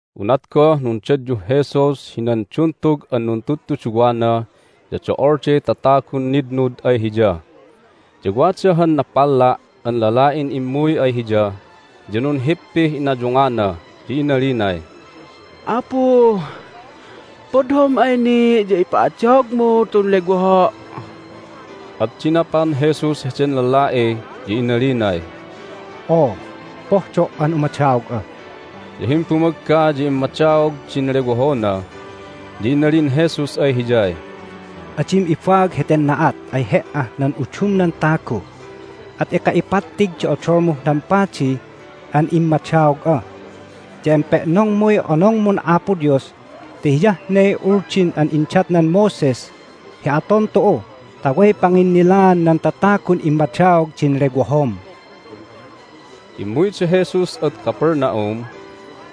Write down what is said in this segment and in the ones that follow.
Unat goh nundadyuh Jesus hinan duntug an nuntudtuduwana ya do'olday tatagun nitnud ay Hiya. Ya wada han napalla' an lala'in immuy ay Hiya, ya nunhippih inayungana, ya inalinay, "Apu, pohdom ay ni' ya ipa'adaogmu tun lewoho'!" At dinapan Jesus heden lala'i, ya inalinay, "Oo, pohdo' an umadaog'a!" Ya himbumagga ya immadaog din lewohona. Ya inalin Jesus ay hiyay, "Adim ibaag heten na'at ay he"ah nan udumnan tagu, at eka ipattig di odolmuh nan padi an immadaog'a, ya empe'nongmuy onongmun Apo Dios ti hiyah ne Uldin an indatnan Moses hi aton tu'u ta way panginnilaan nan tatagun immadaog din lewohom." Immuy da Jesus ad Capernaum.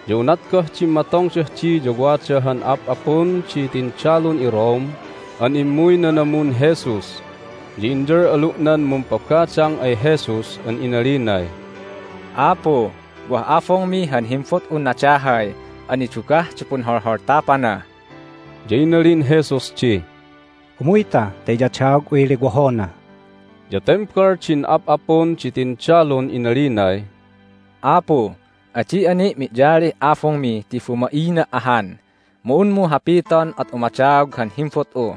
Ya unat goh dimmatongdah di ya wada han ap'apun di tindalun iRome an immuy nanamun Jesus, ya inyal'alu'nan mumpabadang ay Jesus an inalinay, "Apu, wah abungmi han himbut'un nadahay an nidugah di punholholtapana!" Ya inalin Jesus di, "Umuyta ta iyadaog'uy lewohona." Ya tembal din ap'apun di tindalun inalinay, "Apu, adi'a ni' mi'yalih abungmi ti bumaina' ahan. Mu unmu hapiton at umadaog han himbut'u.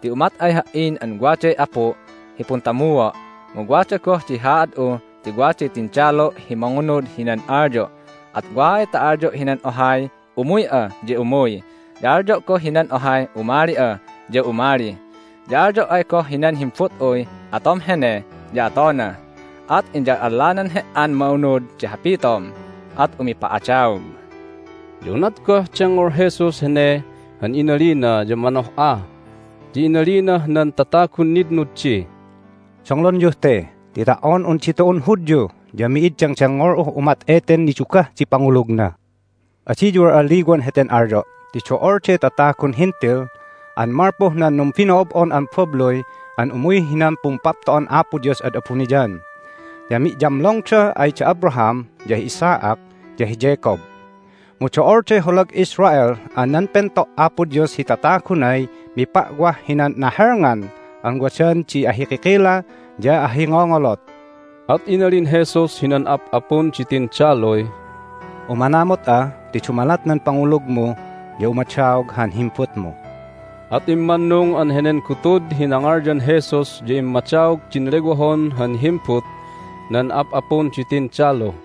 Ti umat ay ha"in an waday apu' hi puntamua'. Mu wada goh di haad'u ti waday tindalu' hi mangunud hinan alyo'. At wa ay ta alyo' hinan ohay, Umuy'a! ya umuy. Ya alyo' goh ay hinan ohay, Umali'a! ya umali. Ya alyo' ay goh hinan himbut'uy, Atom hene! ya atona. At iyal'allanan He"an ma'unud di hapitom, at umipa'adaog!" Ya unat goh dengngol Jesus hene han inalina ya manoh'a, ya inalinah nan tatagun nitnud di, "Donglonyuh te, ti ta"on un ditu'un Hudyu ya mi'id dengdengngol'uh umat eten nidugah di pangulugna! Adiyu al'alliwan heten alyo' ti do'olday tatagun Hentil an malpuh nan numbino'ob'on an babluy an umuy hinan Pumpapto'an Apo Dios ad abuniyan, ya mi'yamlongda ay da Abraham, ya hi Isaac, ya hi Jacob. Mu do'olday holag Israel an nan pento' Apo Dios hi tatagunay mipa'wah hinan nahelngan an wadan di ahikikila ya ahingongolot." At inalin Jesus hinan ap'apun di tindaluy, "Umanamut'a ti dumalat nan pangulugmu ya umadaog han himbutmu." At immannung an henen gutud hi nangalyan Jesus ya immadaog din lewohon han himbut nan ap'apun di tindalu.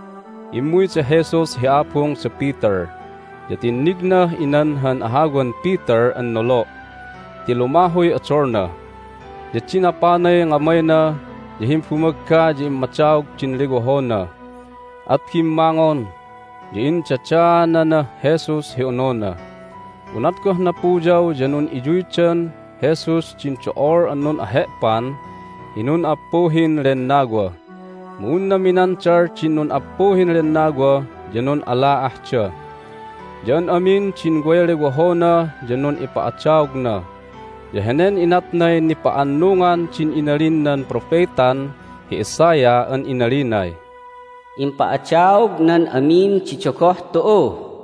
Immuy da Jesus hi abung da Peter, ya tinnignah inan han ahawan Peter an nolo' ti lumahuy odolna. Ya dinapanay ngamayna, ya himbumagga ya immadaog din lewohona, at bimmangon, ya indadaananah Jesus hi onona. Unat goh napuyaw ya nun'inyuydan Jesus din do'ol an nun'ahe'pan hi nun'appuhin lennawa, mu unna minandal din nun'appuhin lennawa ya nun'ala'ahda. Ya an amin din way lewohona ya nun'ipa'adaogna. Ya henen inatnay nipa'annungan din inalin nan propetan hi Isaiah an inalinay, "Impa'adaognan amin di dogoh tu'u."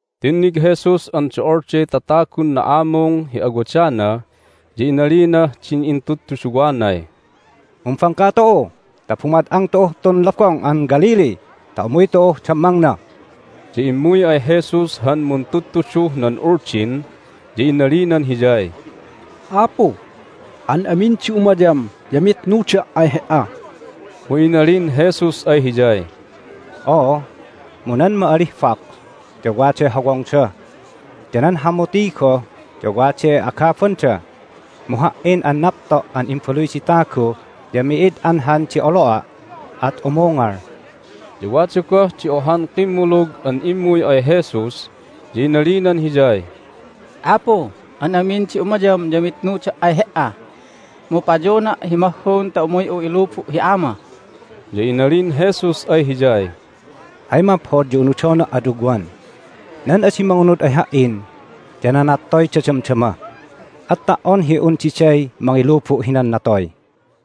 Tinnig Jesus an do'olday tatagun na'amung hi awadana, ya inalinah din intudtuduwanay, "Mumbangka tu'u ta bumad'ang tu'uh tun Lobong an Galilee ta umuy tu'uh dammangna." Ya immuy ay Jesus han muntudtuduh nan Uldin, ya inalinan Hiyay, "Apu, an amin di umayam ya mitnuda' ay He"a!" Mu inalin Jesus ay hiyay, "Oo, mu nan ma'alih fox ya waday hawongda, ya nan hamuti goh ya waday agabanda, mu Ha"in an Napto' an Imbaluy di Tagu ya mi'id anhan di olo'a', at umungal." Ya wada goh di ohan kimmulug an immuy ay Jesus, ya inalinan Hiyay, "Apu, an amin di umayam ya mitnuda' ay He"a! Mu payona' hi mahhun ta umuy'u ilubu' hi ama." Ya inalin Jesus ay hiyay, "Hay maphod ya unudona' ad ugwan. Nan adi mangunud ay Ha"in ya nanattoyda damdama, at ta"on hi un diday mangilubu' hinan natoy."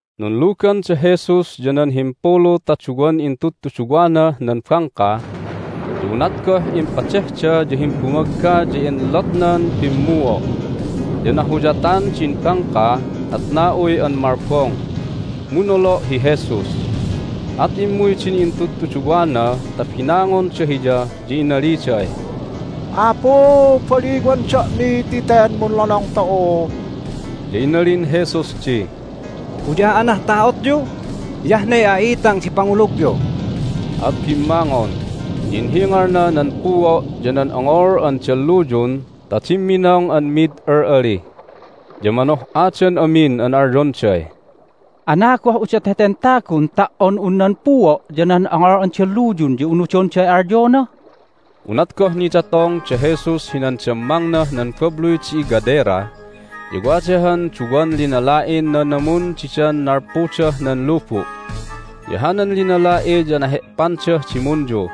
Nunlugan da Jesus ya nan himpulu ta duwan intudtuduwanah nan bangka. Ya unat goh impadehda ya himbumagga ya enlotnan pimmuo', ya nahuyatan din bangka, at na'uy an malbong. Mu nolo' hi Jesus. At immuy din intudtuduwana ta binangonda Hiya, ya inaliday, "Apu, baliwan da'mi ti ten munlonong tu'u!" Ya inalin Jesus di, "Uya'anah ta'otyu? Hiyah ne a'itang di pangulugyu!" At bimmangon, ya inhingalna nan puo' ya nan ongol an dalluyun ta dimminong an mid al'ali. Ya manoh'adan amin an alyonday, "Anagoh udot heten tagun ta"on un nan puo' ya nan ongol an dalluyun ya unudonday alyona?" Unat goh nidatong da Jesus hinan dammangnah nan babluy di iGadera. Ya wada han duwan linala'in nanamun didan nalpudah nan lubu'. Ya hanan linala'i ya nahe'pandah dimunyu,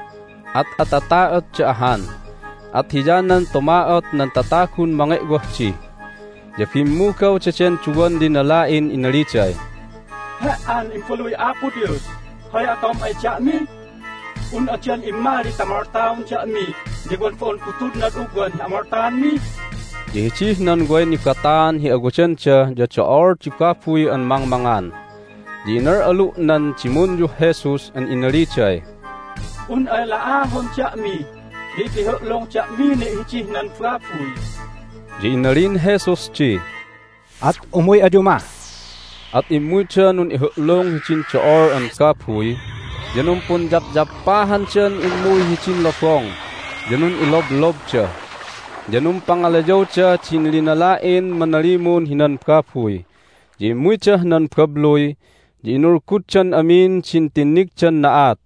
at atata'otda ahan, at hiyanan tuma'ot nan tatagun mange'wah di. Ya bimmugaw daden duwan linala'in inaliday, "He"an Imbaluy Apo Dios, hay atom ay da'mi? Un'a dan immali ta moltaon da'mi ya wan bo'on gutudnad ugwan hi amoltaanmi?" Ya hidih nan way nibataan hi awadanda ya do'ol di babuy an mangmangan. Ya inal'alu' nan dimunyuh Jesus an inaliday, "Un ay la'ahon da'mi ya ipihu'lung da'mi ni' hidih nan babuy!" Ya inalin Jesus di, "At umuy ayu mah." At immuyda nun'ihu'lung hidin do'ol an babuy, ya numpunyapyappahandan immuy hidin lobong, ya nun'iloblobda. Ya numpangalayawda din linala'in manalimun hinan babuy, ya immuydah nan babluy, ya inulguddan amin din tinnigdan na'at,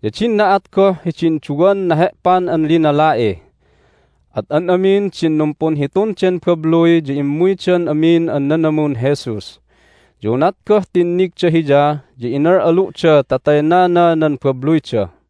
ya din na'at goh hidin duwan nahe'pan an linala'i. At an amin din numpunhitun den babluy ya immuydan amin an nanamun Jesus. Ya unat goh tinnigda Hiya ya inal'alu'da ta taynana nan babluyda.